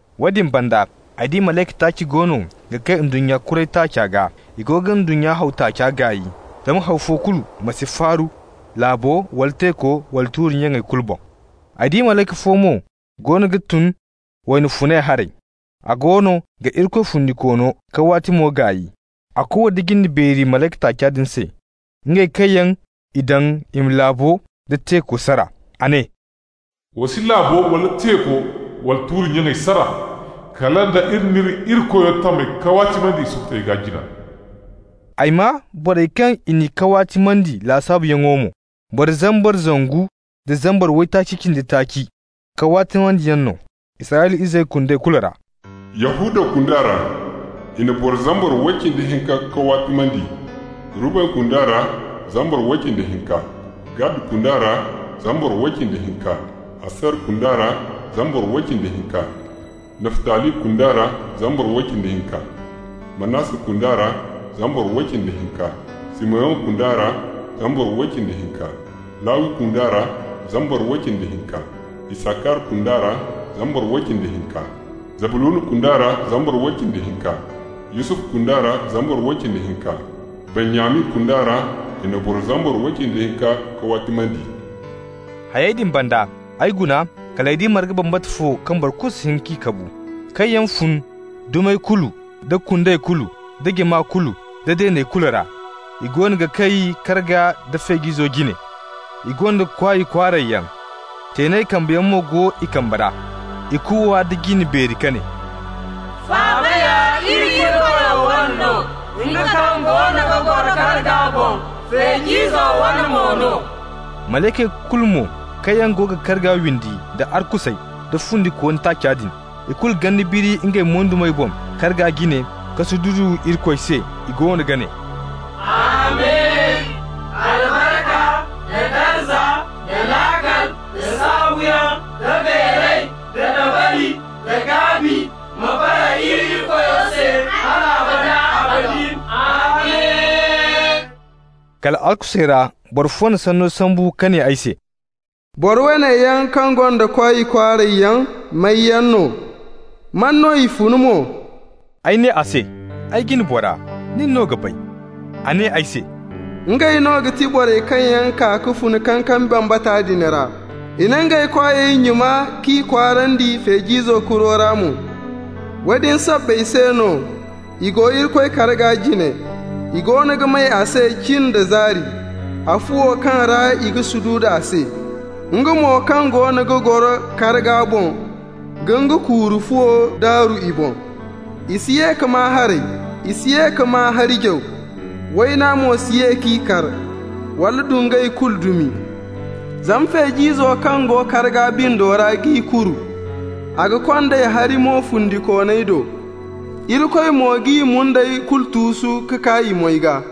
Woodin banda ay di malayka taaci goono ga kay ndunnya kuray taaca gaa. I goono ga ndunnya haw taaca gaay, zama haw fo kulu ma si faaru laabo wala teeko wala tuuri-nya kulu boŋ. Ay di malayka fo mo goono ga tun wayna funay haray. A goono ga Irikoy fundikoono kawaatimo gaay. A kuuwa nda jinde beeri malayka taaca din se, ngey kaŋ yaŋ i daŋ i ma laabo nda teeko sara. A ne: «Wa si laabo wala teeko wala tuuri nyaŋey sara, kala nda iri n'iri Irikoyo tamey kawaatimandi i sukutey gaa jina.» Ay maa borey kaŋ yaŋ i n'i kawaatimandi lasaabuyaŋo mo. Boro zambar zangu da zambar waytaaci cindi taaci kawaatimanteyaŋ no, Israyla izey kundey kulu ra. Yahuda kunda ra i na boro zambar way cindi hinka kawaatimandi. Ruben kunda ra, zambar way cindi hinka; Gad kunda ra, zambar way cindi hinka; Aser kunda ra, zambar way cindi hinka; Naftali kunda ra, zambar way cindi hinka; Manasse kunda ra, zambar way cindi hinka; Simeyon kunda ra, zambar way cindi hinka; Lawi kunda ra, zambar way cindi hinka; Isakar kunda ra, zambar way cindi hinka; Zabluna kunda ra, zambar way cindi hinka; Yusufu kunda ra, zambar way cindi hinka; Benyamin kunda ra, i na boro zambar way cindi hinka kawaatimandi. Hayey din banda, ay guna kal ay di marga bambata fo kaŋ boro kulu si hin k'a kabu, kaŋ yaŋ fun dumey kulu nda kundey kulu nda jama kulu nda deeney kulu ra. I goono ga kay karga nda Feej'izo jine. I gonda kwaay kwaaray yaŋ. Teenay kambeyaŋ mo go i kambe ra. I kuuwa nda jinde beeri ka ne: «Faaba ya iri Irikoyo wane no, nga kaŋ goono ga goro karga boŋ, Feej'izo wane mo no.» Malaykey kulu mo kaŋ yaŋ go ga karga windi, da arkusey, da fundikooni taaca din, ikulu ganda biri ngey moydumey boŋ karga jine ka sududu Irikoy se. I goono ga ne: «Amin! Albarka, da darza, da laakal, da saabuyaŋ, da beeray, da dabari, da gaabi ma bara iri Irikoyo se hal abada abadin. Amin!» Kal arkusey ra boro fo na sanno sambu ka ne ay se: «Boro woone yaŋ kaŋ gonda kwaay kwaaray yaŋ, may yaŋ no? Man no i fun mo?» Ay ne a se: «Ay jina bora, nin no ga bay.» A ne ay se: «Ngey no ga ti borey kaŋ yaŋ kaa ka fun kankami bambata din ra. I na ngey kwaayey nyuna k'i kwaarandi Feej'izo kuro ra mo. Woodin sabbay se no, I go Irikoy karga jine. I goono ga may a se cin da zaari a fuwo kaŋ ra i ga sududu a se. Nga mo kaŋ goono ga goro karga boŋ ga nga kuuru fuwo daaru i boŋ. I si ye ka maa haray, i si ye ka maa hari jaw, wayna mo si ye k'i kar wala dungay kulu dumi. Zama Feej'izo kaŋ go karga bindo ra g'i kuru. A ga kond'ey hari-mo fundikooney do. Irikoy mo g'i mundey kulu tuusu ka kaa i moy gaa.»